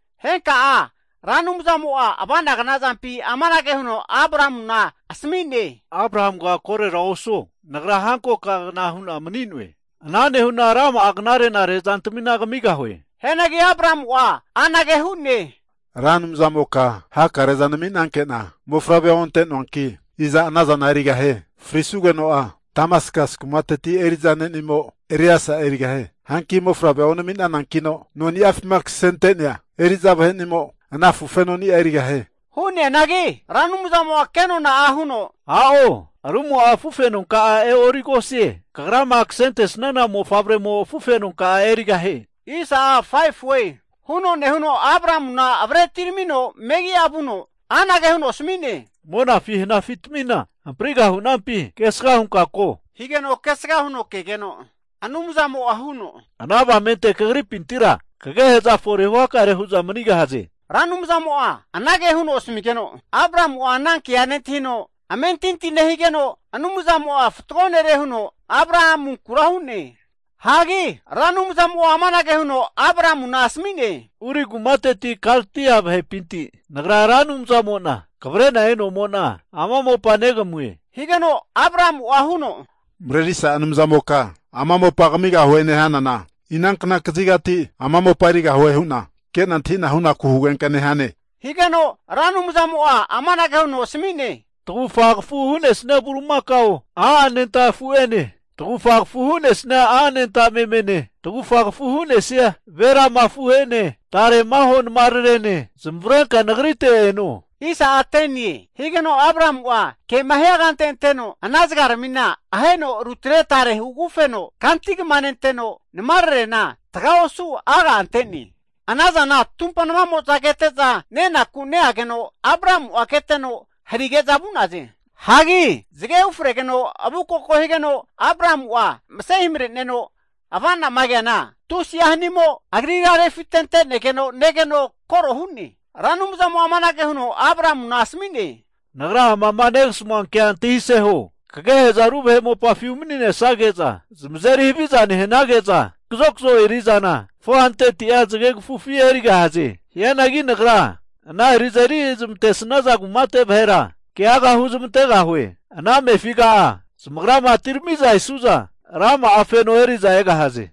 Henka'a Ra Anumzamo'a ava'na gnazampi amanage huno Abramuna asami'ne, Abramuga korera osu. Nagra hankoka'agna hu'na mani'noe. Ana nehu'na rama'a knare'nare zantamina kamigahue. Hianagi Abramu'a anage hu'ne, Ra Anumzamoka hakare'za nami'nanke'na, mofavre onte'noanki, iza anazana erigahie? Frisugeno'a Damaskasi kumati eri'za ne'nimo Eliesa erigahie. Hanki mofavre onami'nanankino, noni'afima kasente'nea eri'za vahe'nimo ana afufenoni'a erigahie. Hu'neanagi Ra Anumzamo'a kenona'a huno, A'o! Rumo'a afufenonka'a e'origosie. Kagrama kasentesana mofavremo afufenonka'a erigahie. Huno nehuno Abramuna avre atiramino megi'a vuno anage huno asmi'ne, monafi hanafitamina hampriga hunampi kesga hunka ko? Higeno kesga huno kegeno, Anumzamo'a huno, ana avamente kagripintira kagehe'za fore huhakare hu'za manigahaze. Ra Anumzamo'a anage huno asmigeno, Abramu'a ana kea nentahino, amentinti nehigeno Anumzamo'a fatgo nere huno Abramunkura hu'ne. Hagi Ra Anumzamo'a amanage huno Abramuna asami'ne, Ur kumateti, Kaldia vahepinti Nagra Ra Anumzamo'na kavre'na e'nomo'na, ama mopa negamue. Higeno Abramu'a huno, Marerisa Anumzamoka ama mopa kamigahue nehanana, inankna kazigati ama mopa erigahue hu'na ke'na antahi'na hunaku hugenka nehane? Higeno Ra Anumzamo'a amanage huno asami'ne, Tagufa kafu hu'nesia bulimakao a' anenta afu'ene, tagufa kafu hu'nesia a' anenta memene, tagufa kafu hu'nesia ve lama afu'ene, tare maho namararene, zamavarenka Nagrite eno. Higeno Abramu'a kema hia kante anteno ana zagaramina aheno rutne tare hugagufeno kanti kama nenteno, namararena taga osu aga' ante'ne. Ana zana tumpa namamo'za kete'za nenaku neageno Abramu'a keteno harige'za vu'naze. Hagi zage ufregeno avukoko higeno Abramu'a mase himare'neno, avanama keana, tusi'a hanimo agrira refitente'negeno negeno koro hu'ne. Ra Anumzamo'a amanage huno Abramuna asami'ne, Nagra amama negasamua kea antahise huo. Kagehe'za ru vahe mopafi umani'nesage'za zamazeri haviza nehanage'za, kazokzo eri'zana 400'a zagegafufi erigahaze. Hianagi Nagra ana eri'za eri'zmantesaza kumate vahera keaga huzamantegahue. Ana amefiga'a zamagrama atirami'za esu'za, rama'a feno eri'za egahaze.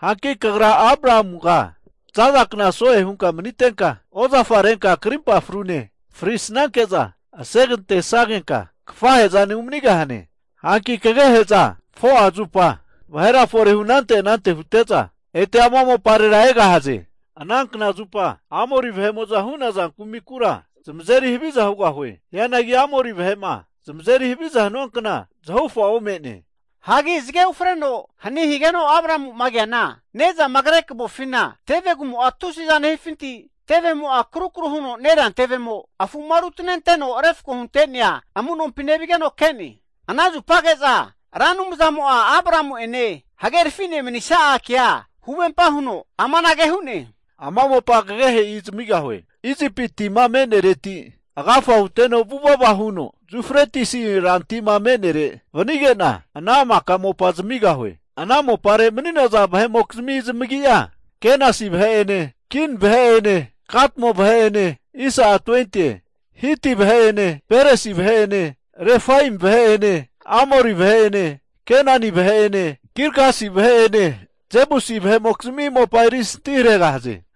Hanki kagra Abramuga zaza kna so'e hunka manitenka, ozafa renka krimpa frune frisanke'za asegantesagenka kafahezane umanigahane. Hanki kagehe'za 4'a zupa vahera forehu anante anante hute'za, ete ama moparera egahaze. Ana knazupa Amori vahe'mo'zama hu'naza kumikura zamazeri haviza hugahue. Hianagi Amori vahe'ma zamazeri haviza hanua kna zahufa ome'ne. Hagi zage ufreno hani higeno Abramu'ma keana, nezama kre kavofina tevegumo'a tusiza nehifinti, tevemo'a akrukru huno nerea tevemo afu'ma rutanenteno refko hunte'nea amunompi nevigeno ke'ne. Ana zupage'za Ra Anumzamo'a Abramu'ene hagerfine manisa'a kea huvempa huno amanage hu'ne, ama mopa kagehe'i zamigahue. Isipi tima me'nereti agafa huteno vuvava huno, Jufretisi rantima me'nere vanige'na, ana maka mopa zamigahue. Ana mopare mani'naza vahe'mokizmi zamagi'a, Kenasi vahe'ene, Kin vahe'ene, Kadmo vahe'ene, Hiti vahe'ene, Peresi vahe'ene, Refaemi vahe'ene, Amori vahe'ene, Kenani vahe'ene, Gilgasi vahe'ene, Jebusi vahe'mokizmi mopa erisanti haregahaze.